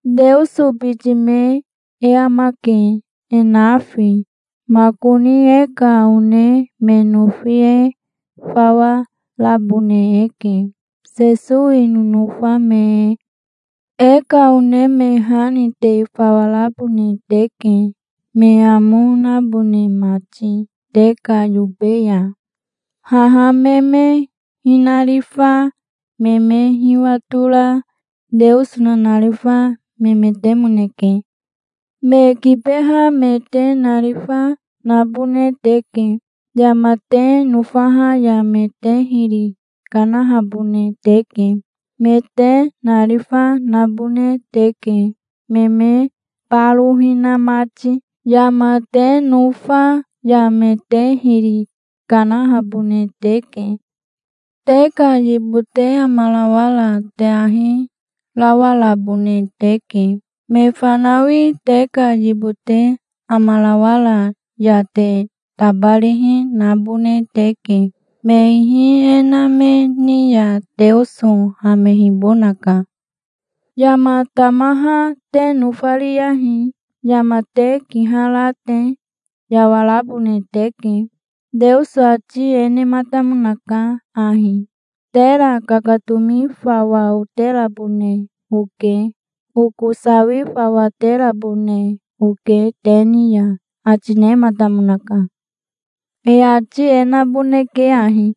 Teoso biti me e amake, e nafi. Makoni e ka one me nofi e fawa rabone eke, Sesowi nonofa me e. E ka one me ha ni te fawa rabone teke, me amo nabone mati te ka yobe ya. Haha me me hinarifa me me hiwatora Teoso nanarifa memetemoneke. Me kibeha me te narifa nabone teke. Yama te nofaha ya me te hiri kanahabone teke. Me te narifa nabone teke, me me baro hina mati. Yama te nofa ya me te hiri kanahabone teke. Te ka yibote amarawara te ahi rawarabone teke. Me fanawi te ka yibote amarawara ya te tabarihi nabone teke. Me ihi e na me ni ya Teoso hamehibonaka. Yama tamaha te nofariyahi. Yama te kihara te yawarabone teke. Teoso ati e nematamonaka ahi: "Tera kakatomi fawa oterabone oke. Oko sawi fawa terabone oke te ni ya", ati nematamonaka. E ati e naboneke ahi: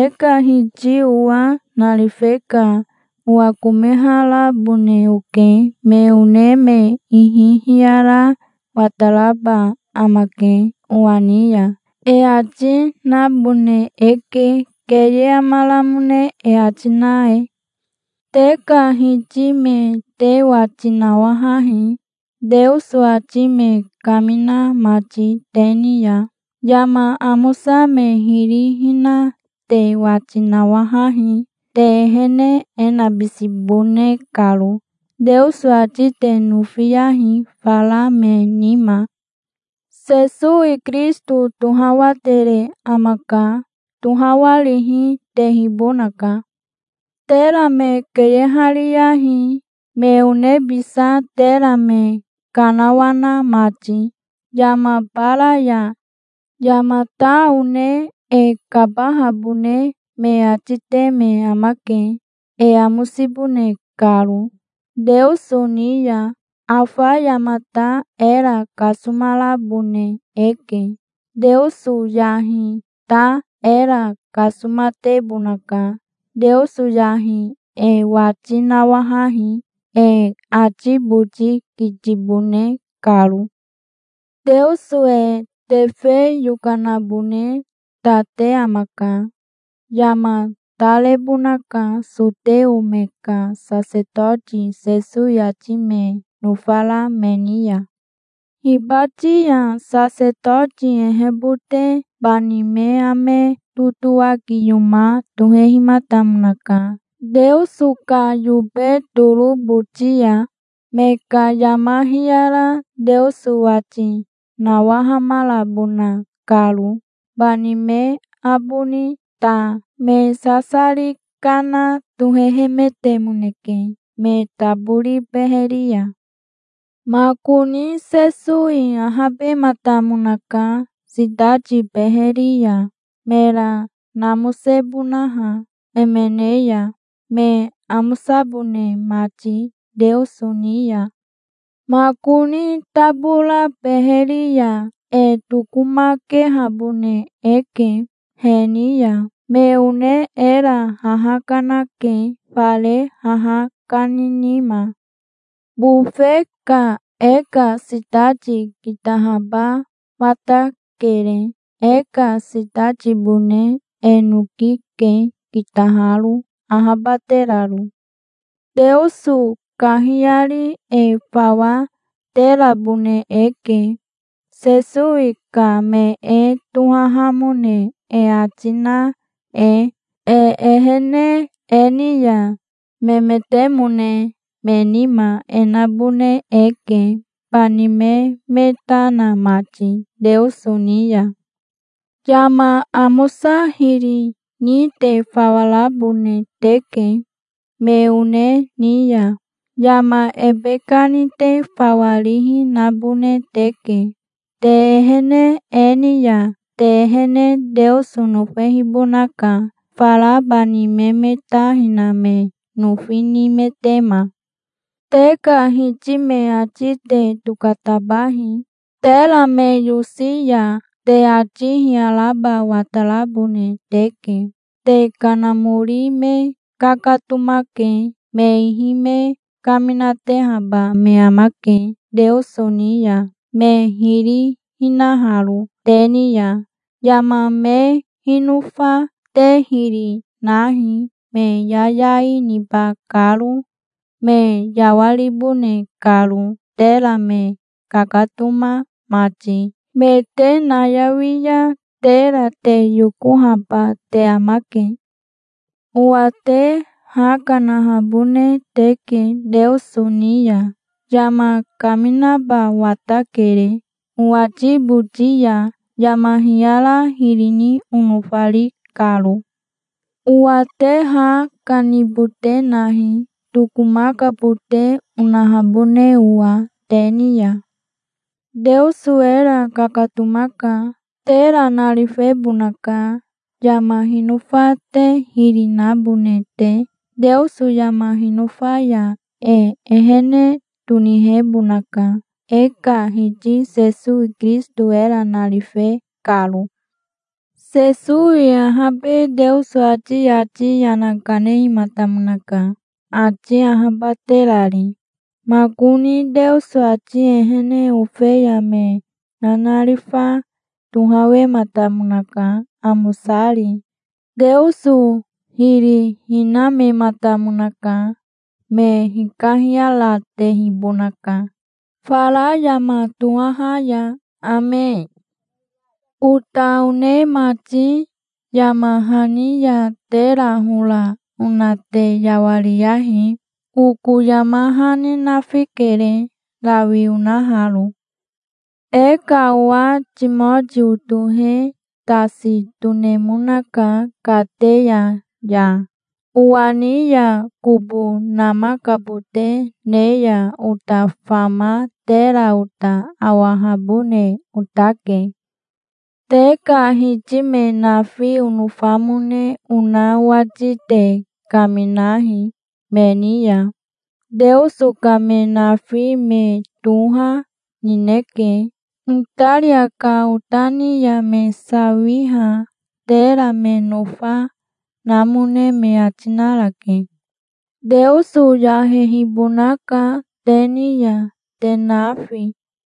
"E ka Hiti owa narife ka owakomeharabone oke. Me one me ihi hiyara wataraba amake owa ni ya", e ati nabone eke, keye amaramone e ati na e. Te ka hiti me te wati nawahahi, Teoso ati me kamina mati te ni ya. Yama amosa me hiri hina te wati nawahahi, te ehene e nabisibone karo. Teoso ati te nofiyahi, fara me nima. Sesowi Kirisito tohawatere amaka. Tohawarihi tehibonaka. Tera me keyehariyahi, me onebisa, tera me kanawana mati yama bara ya. Yamata one e kabahabone me ati te me amake, e amosibone karo Teoso ni ya. Afa yamata era kasomarabone eke. Teoso yahi ta era kasomatebonaka. Teoso yahi e wati nawahahi, e ati boti kitibone karo. Teoso e tefe yokanabone ta te amaka. Yama ta rebonaka soteo me ka sasetoti Sesowi ati me nofara me ni ya. Hibati ya sasetoti ehebote bani me ame totowakiyoma tohehimatamonaka Teoso ka yobe toro boti ya, me ka yama hiyara Teoso wati nawahamarabona karo. Bani me aboni ta me sasari kana tohehemetemoneke me tabori beheri ya. Makoni Sesowi ahabematamonaka sitati beheri ya, mera namosebonaha emene ya, me amosabone mati Teoso ni ya. Makoni tabora beheri ya e tokomakehabone eke he ni ya. Me one era haha kanake, fare haha kani nima. Bofe ka e ka sitati kitahaba watakere. E ka sitatibone e noki ke, kitaharo, ahabateraro. Teoso kahiyari e fawa terabone eke, Sesowi ka me e tohahamone e ati na e. E ehene e ni ya memetemone me nima e nabone eke, bani me me ta na mati Teoso ni ya. Yama amosa hiri ni te fawa rabone teke. Me one ni ya yama ebe kani te fawa rihi nabone teke. Te ehene e ni ya te ehene Teoso nofehibonaka, fara bani me me ta hina me nofi nimetema. Te ka hiti me ati te tokatabahi. Tera me yose ya te ati hiyaraba watarabone teke. Te kanamori me kakatomake. Me ihi me kaminatehaba me amake Teoso ni ya, me hiri hinaharo te ni ya. Yama me hinofa te hiri nahi, me yayai niba karo, me yawaribone karo, tera me kakatoma mati. Me te nayawi ya tera te yokohaba te amake. Owa te ha kanahabone teke Teoso ni ya. Yama kaminaba watakere owati boti ya, yama hiyara hiri ni onofari karo. Owa te ha kanibote nahi, tokomakabote onahabone owa te ni ya. Teoso era kakatomaka. Tera narifebonaka, yama hinofa te hiri nabone te. Teoso yama hinofa ya e ehene tonihebonaka, e ka Hiti Sesowi Kirisito era narife karo. Sesowi ahabe Teoso ati yati yana kanehimatamonaka, ati ahabaterari. Makoni Teoso ati ehene ofeya me nanarifa tohawematamonaka, amosari. Teoso hiri hinamematamonaka. Me hikahiyaratehibonaka fara yama tohaha ya. Ame. Ota one mati, yama hani ya tera hora ona te yawariyahi. Oko yama hani nafikere, rawi onaharo. E ka owa Timotio tohe tasi tonemonaka kateya ya. Owa ni ya kobo namakabote ne ya ota fama tera ota awahabone otake. Te ka hiti me nafi onofamone ona owati te kaminahi me ni ya. Teoso ka me nafi me toha nineke. Itaria ka ota ni ya me sawiha tera me nofa, namone me ati narake. Teoso yahehibonaka te ni ya, te nafi.